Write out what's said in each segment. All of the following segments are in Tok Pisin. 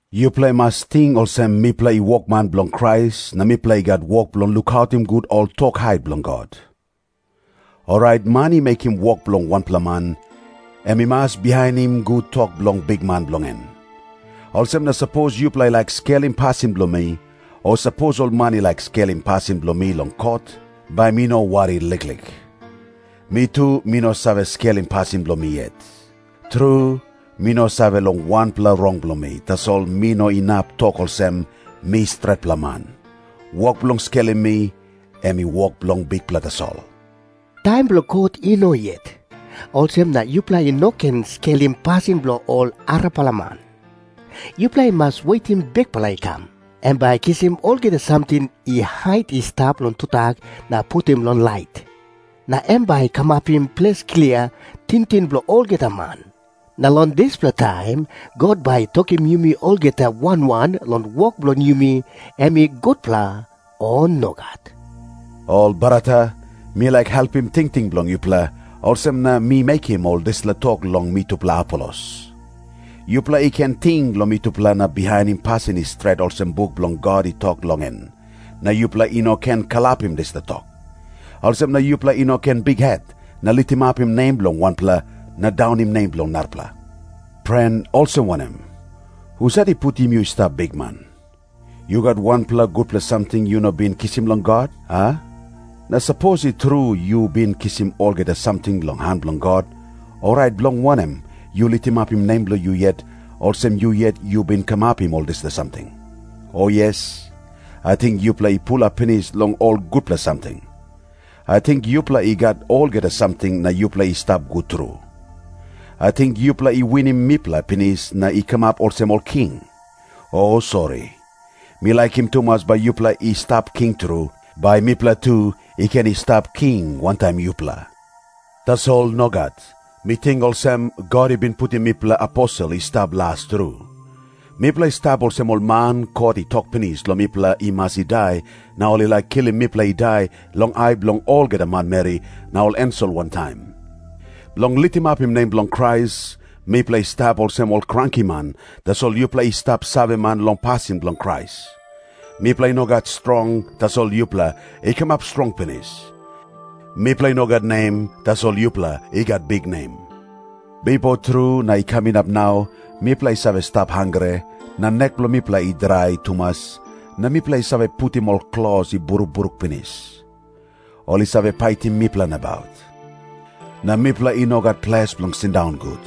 Yupela i mas ting olsem mipela i wokman bilong Krais na mipela i gat wok bilong lukautim gut ol tok hait bilong God. Orait man i mekim wok bilong wanpela man, em i mas bihainim gut tok bilong bikman bilong en. Olsem na sapos yupela i laik skelim pasin bilong mi, o sapos ol man i laik skelim pasin bilong mi long kot, bai mi no wari liklik. Mi tu mi no save skelim pasin bilong mi yet. Tru, mi no save long wanpela rong bilong mi, tasol mi no inap tok olsem, "Mi stretpela man." Wok bilong skelim mi, em i wok bilong Bikpela tasol. Taim bilong kot i no yet, olsem na yupela i no ken skelim pasin bilong ol arapela man. Yupela i mas wetim Bikpela i kam. Em bai i kisim olgeta samting i hait i stap long tudak na putim long lait. Na em bai i kamapim ples klia tingting bilong olgeta man. Na long dispela taim God bai i tokim yumi olgeta wan wan long wok bilong yumi em i gutpela, o nogat. Ol brata, mi laik helpim tingting bilong yupela, olsem na mi mekim ol dispela tok long mitupela Apolos. Yupela i ken ting long mitupela na bihainim pasin i stret olsem buk bilong God i tok long en, na yupela i no ken kalapim dispela tok. Olsem na yupela i no ken bikhet na litimapim nem bilong wanpela na daunim nem bilong narapela. Pren, olsem wanem? Husat i putim yu i stap bikman? Yu gat wanpela gutpela samting yu no bin kisim long God, a? Na sapos i tru yu bin kisim olgeta samting long han bilong God, orait bilong wanem yu litimapim nem bilong yu yet, olsem yu yet yu bin kamapim ol dispela samting? O yes, ating yupela i pulap pinis long ol gutpela samting. Ating yupela i gat olgeta samting na yupela i stap gut tru. Ating yupela i winim mipela pinis na i kamap olsem ol king. O sori, mi laikim tumas bai yupela i stap king tru, bai mipela tu i ken i stap king wantaim yupela. Tasol nogat. Mi ting olsem, God i bin putim mipela aposel i stap las tru. Mipela i stap olsem ol man, kot i tok pinis long mipela i mas i dai, na ol i laik kilim mipela i dai long ai bilong olgeta manmeri na ol ensel wantaim. Bilong litimapim nem bilong Krais, mipela i stap olsem ol krankiman, tasol yupela i stap saveman long pasin bilong Krais. Mipela i no gat strong, tasol yupela i kamap strong pinis. Mipela i no gat nem, tasol yupela i gat biknem. Bipo tru na i kam inap nau, mipela i save stap hangre, na nek bilong mipela i drai tumas, na mipela i save putim ol klos i brukbruk pinis. Ol i save paitim mipela nabaut. Na mipela i no gat ples bilong sindaun gut.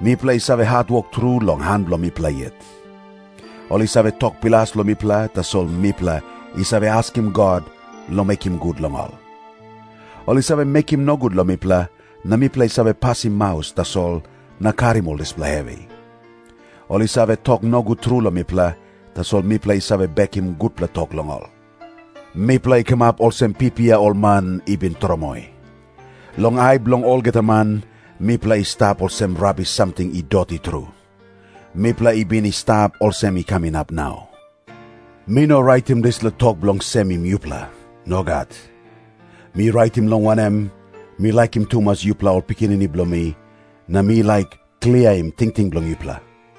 Mipela i save hatwok tru long han bilong mipela yet. Ol i save tok bilas long mipela, tasol mipela i save askim God long mekim gut long ol. Ol i save mekim nogut long mipela, na mipela i save pasim maus tasol na karim ol dispela hevi. Ol i save tok nogut tru long mipela, tasol mipela i save bekim gutpela tok long ol. Mipela i kamap olsem pipia ol man i bin tromoi. Long ai bilong olgeta man, mipela i stap olsem rabis samting i doti tru. Mipela i bin i stap olsem i kam inap nau. Mi no raitim dispela tok bilong semim yupela. Nogat. Mi raitim, long wanem, mi laikim tumas yupela ol pikinini bilong mi, na mi laik kliaim tingting bilong yupela.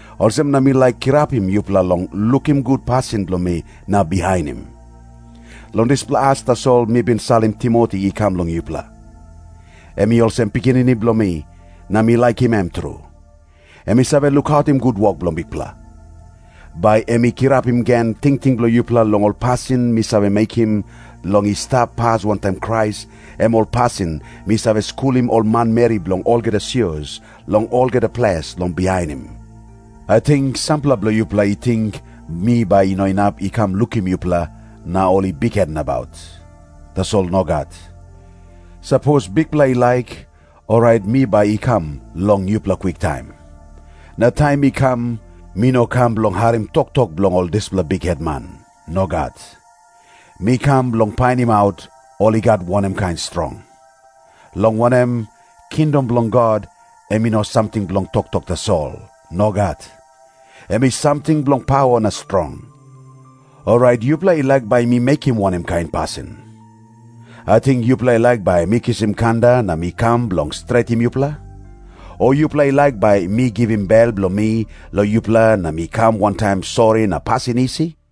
Olsem na mi laik kirapim yupela long lukim gut pasin bilong mi na bihainim. Long dispela as tasol mi bin salim Timoti i kam long yupela. Em i olsem pikinini bilong mi, na mi laikim em tru. Em i save lukautim gut wok bilong Bikpela. Bai em i kirapim gen tingting bilong yupela long ol pasin mi save mekim long i stap pas wantaim Krais, em ol pasin mi save skulim ol manmeri bilong olgeta sios long olgeta ples long bihainim. Ating sampela bilong yupela i ting mi bai no inap i kam lukim yupela, na ol i bikhet nabaut. Tasol nogat. Sapos Bikpela i laik, orait mi bai i kam long yupela kwiktaim. Na taim mi kam, mi no kam bilong harim toktok bilong ol dispela bikhetman. Nogat. Mi kam bilong painimaut, ol i gat wanem kain strong. Long wanem, kingdom bilong God em i no samting bilong toktok tasol. Nogat. Em i samting bilong pawa na strong. Orait yupela i laik bai mi mekim wanem kain pasin? Ating yupela i laik bai mi kisim kanda na mi kam bilong stretim yupela? O yupela i laik bai mi givim bel bilong mi long yupela na mi kam wantaim sori na pasin isi?